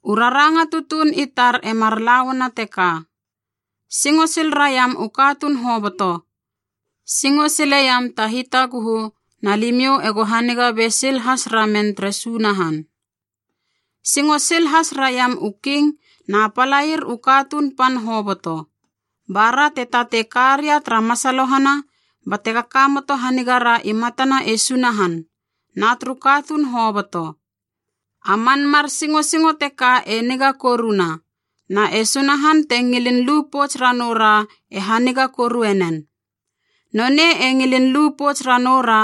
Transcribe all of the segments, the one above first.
U raranga tutuun i tar e mar la uana teka, singo sil raiam u katuun hoboto, singo sileiam ta hitaguhu na limiou ego haniga be sil has ramen tere Sunahan. Singo sil has raiam u king na palair u katuun pan hoboto, ba ra te tatei karia tara masalohana bate kakamoto hanigara i matana e Sunahan na turu katuun hoboto. A man mar singosingo teka e niga koruna, na e Sunahan te ngilin lu pouts ranou ra e haniga korue nen. Nonei e ngilin lu pouts ranoura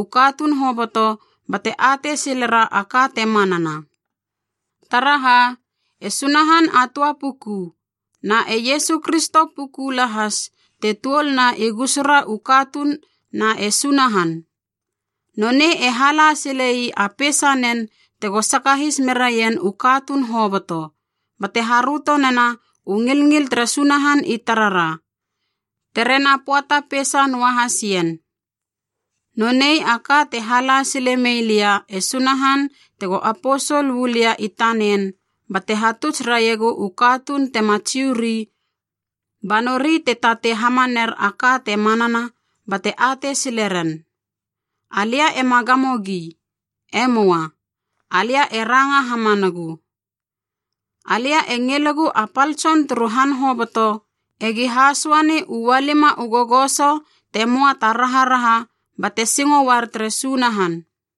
u katuun hoboto bate atei silera a ka te manana. Taraha e Sunahan a töa puku, na e Iesu Kristo puku lahas te tuol na i gusura u katuun na e Sunahan. Nonei e hala sile ii a peisanen tego sakahis meraien u katuun hoboto, bate haröto nena u ngilngil tere Sunahan i tarara, tere na pöata peisa noahas ien. Nonei a ka te hala sile mei lia e Sunahan tego aposol uu lia i tanen, bate hatuts raiegu u katuun tema Jiu ri ba nori te tatei hamaner a ka te manana bate atei sileren. Alia ema gamogi. E möa! Alia e ranga hamanagu. Alia e ngilegu a pal tson turu han hoboto, egi hasöani u ualima u gogoso te möa ta raharaha bate singo uar tere Sunahan.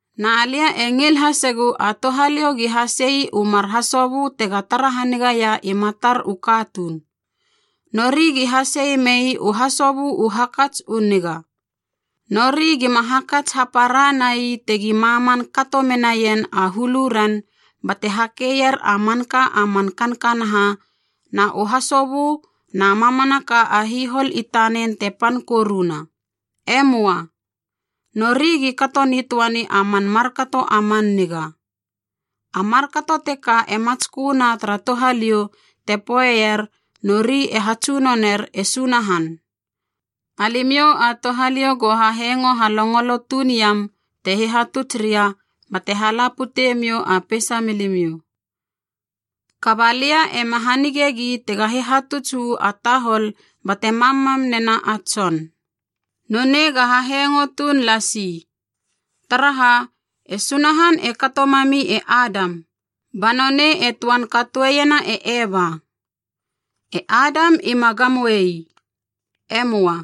Na lia e ngil hasegu a touhaliou gi hasei u mar hasobö tega tara hanigaia i matar u katuun. Nori gi hasei mei u hasobö u hakats u niga. Nori gima hakats hapara nai tegi maman kato menaien a huluren bate hakeier a manka a man kankanaha na u hasobö na mamanaka a hihol i tanen te pan koruna. E möa. Nori gi kato nitöani a man markato a man niga. A markato teka e matsköna tara touhaliou te poeier nori e hatsunoner e Sunahan. Alimiou a touhaliou go hahengo halongolo tuun iam te hihatuts ria bate hala putemiou a peisa milimiou. Kaba lia ema hanigegi tega hihatuts uu a tahol bate mammam nena a tson. Nonei ga hahengo tuun lasi. Taraha, e Sunahan e kato mami e Adam, ba nonei e töan katoeiena e Eva. E Adam ima gamoei. E möa.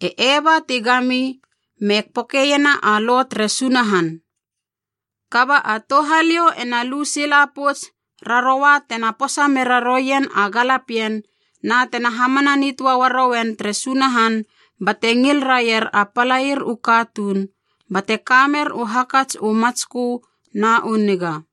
E Eva ti gami me pekoena a lo tere Sunahan. Kaba a touhaliou ena lu sila pouts raroua tena posa mera roien a galapien, na tena hamana nitöa uarouen tere Sunahan bate ngil raier a palair u katuun bate kamer u hakats u matskö na u niga.